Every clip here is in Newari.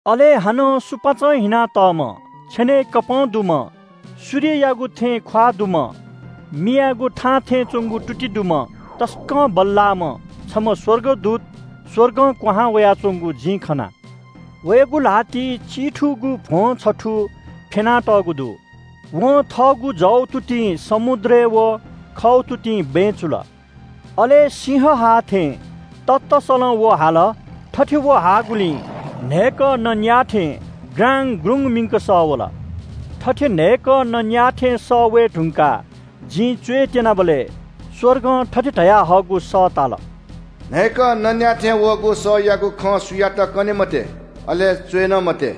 अले हानं सुपाँचं हिनातःम्‍ह, छेनय् इन्‍द्रेणी दुम्‍ह, सूर्ययागु थें ख्‍वाः दुम्‍ह, मियागु थां थें च्‍वंगु तुति दुम्‍ह तसकं बल्‍लाःम्‍ह छम्‍ह स्‍वर्गदूत स्‍वर्गं क्‍वहां वयाच्‍वंगु जिं खना। वयागु ल्‍हातिइ चिथुगु भ्‍वं छथू फ्‍यना तःगु दु। वं थःगु जव तुतिं समुद्रय् व खव तुतिं बँय् चुल। अले सिंह हाःथें ततसलं व हाल। थथे व हाःगुलिं न्‍हय्‌कः नँ न्‍याये थें ग्राङ्‌गग्रुङ्‌ग मिंक सः वल। थथे न्‍हय्‌कः नँ न्‍याये थें सः वये धुंकाः जिं च्‍वय् त्‍यनाबलय् स्‍वर्गं थथे धयाहःगु सः ताल – “न्‍हय्‌कः नँ न्‍याः थें वःगु सःयागु खँ सुयातं कने मते, अले च्‍वये नं मते।”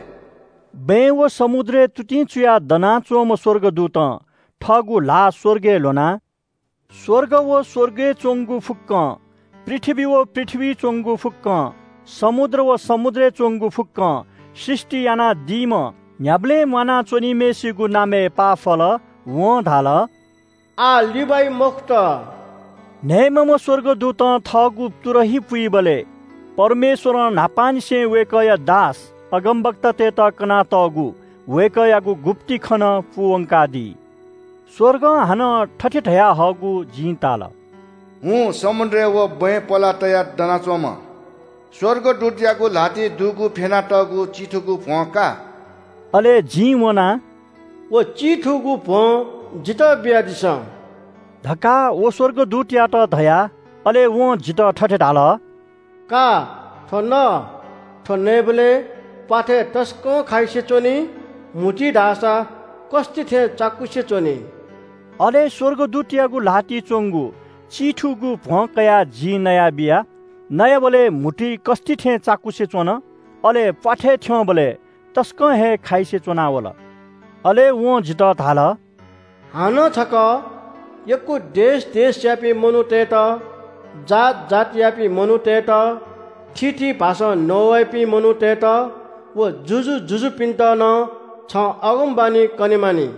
बँय् व समुद्रय् तुतिं चुयाः दनाच्‍वंम्‍ह स्‍वर्गदूतं थःगु ल्‍हाः स्‍वर्गय् ल्‍ह्वनाः स्‍वर्ग व स्‍वर्गय् च्‍वंगु फुक्‍कं, पृथ्‍वी व पृथ्‍वीइ च्‍वंगु फुक्‍कं, समुद्र व समुद्रय् च्‍वंगु फुक्‍कं सृष्‍टि यानादीम्‍ह न्‍ह्याबलें म्‍वाना च्‍वनीम्‍हय्‌सिगु नामय् पाफल। वं धाल – “आः लिबाइ मखुत।” न्‍हय्‌म्‍हम्‍ह स्‍वर्गदूतं थःगु तुरही पुइबलय् परमेश्‍वरं न्‍हापांनिसें वय्‌कःया दास अगमवक्तातय्‌त कनातःगु वय्‌कःयागु गुप्‍ति खँ नं पूवंकादी। स्‍वर्गं हानं थथे धयाहःगु जिं ताल – “हुँ, समुद्रय् व बँय् पलाः तयाः दनाच्‍वंम्‍ह स्‍वर्गदूतयागु ल्‍हातिइ दुगु फ्‍यना तःगु चिथुगु भ्‍वं का।” अले जिं वनाः “व चिथुगु भ्‍वं जितः बियादिसँ” धकाः व स्‍वर्गदूतयात धया। अले वं जितः थथे धाल – “का, थ्‍व न। थ्‍व नयेबलय् प्‍वाथय् तसकं खाइसे च्‍वनी, म्‍हुतुइ धाःसा कस्‍ति थें चाकुसे च्‍वनी।” अले स्‍वर्गदूतयागु ल्‍हातिइ च्‍वंगु चिथुगु भ्‍वं कयाः जिं नयाबिया। नयाबलय् म्‍हुतुइ कस्‍ति थें चाकुसे च्‍वन, अले प्‍वाथय् थ्‍यंबलय् तसकं हे खाइसे च्‍वना वल। अले वं जितः धाल – “हानं छकः यक्‍व देश देशयापिं मनूतय्‌त, जात जातियापिं मनूतय्‌त, थीथी भाषां नवाइपिं मनूतय्‌त व जुजु जुजुपिन्‍त नं छं अगमवाणी कने मानि।”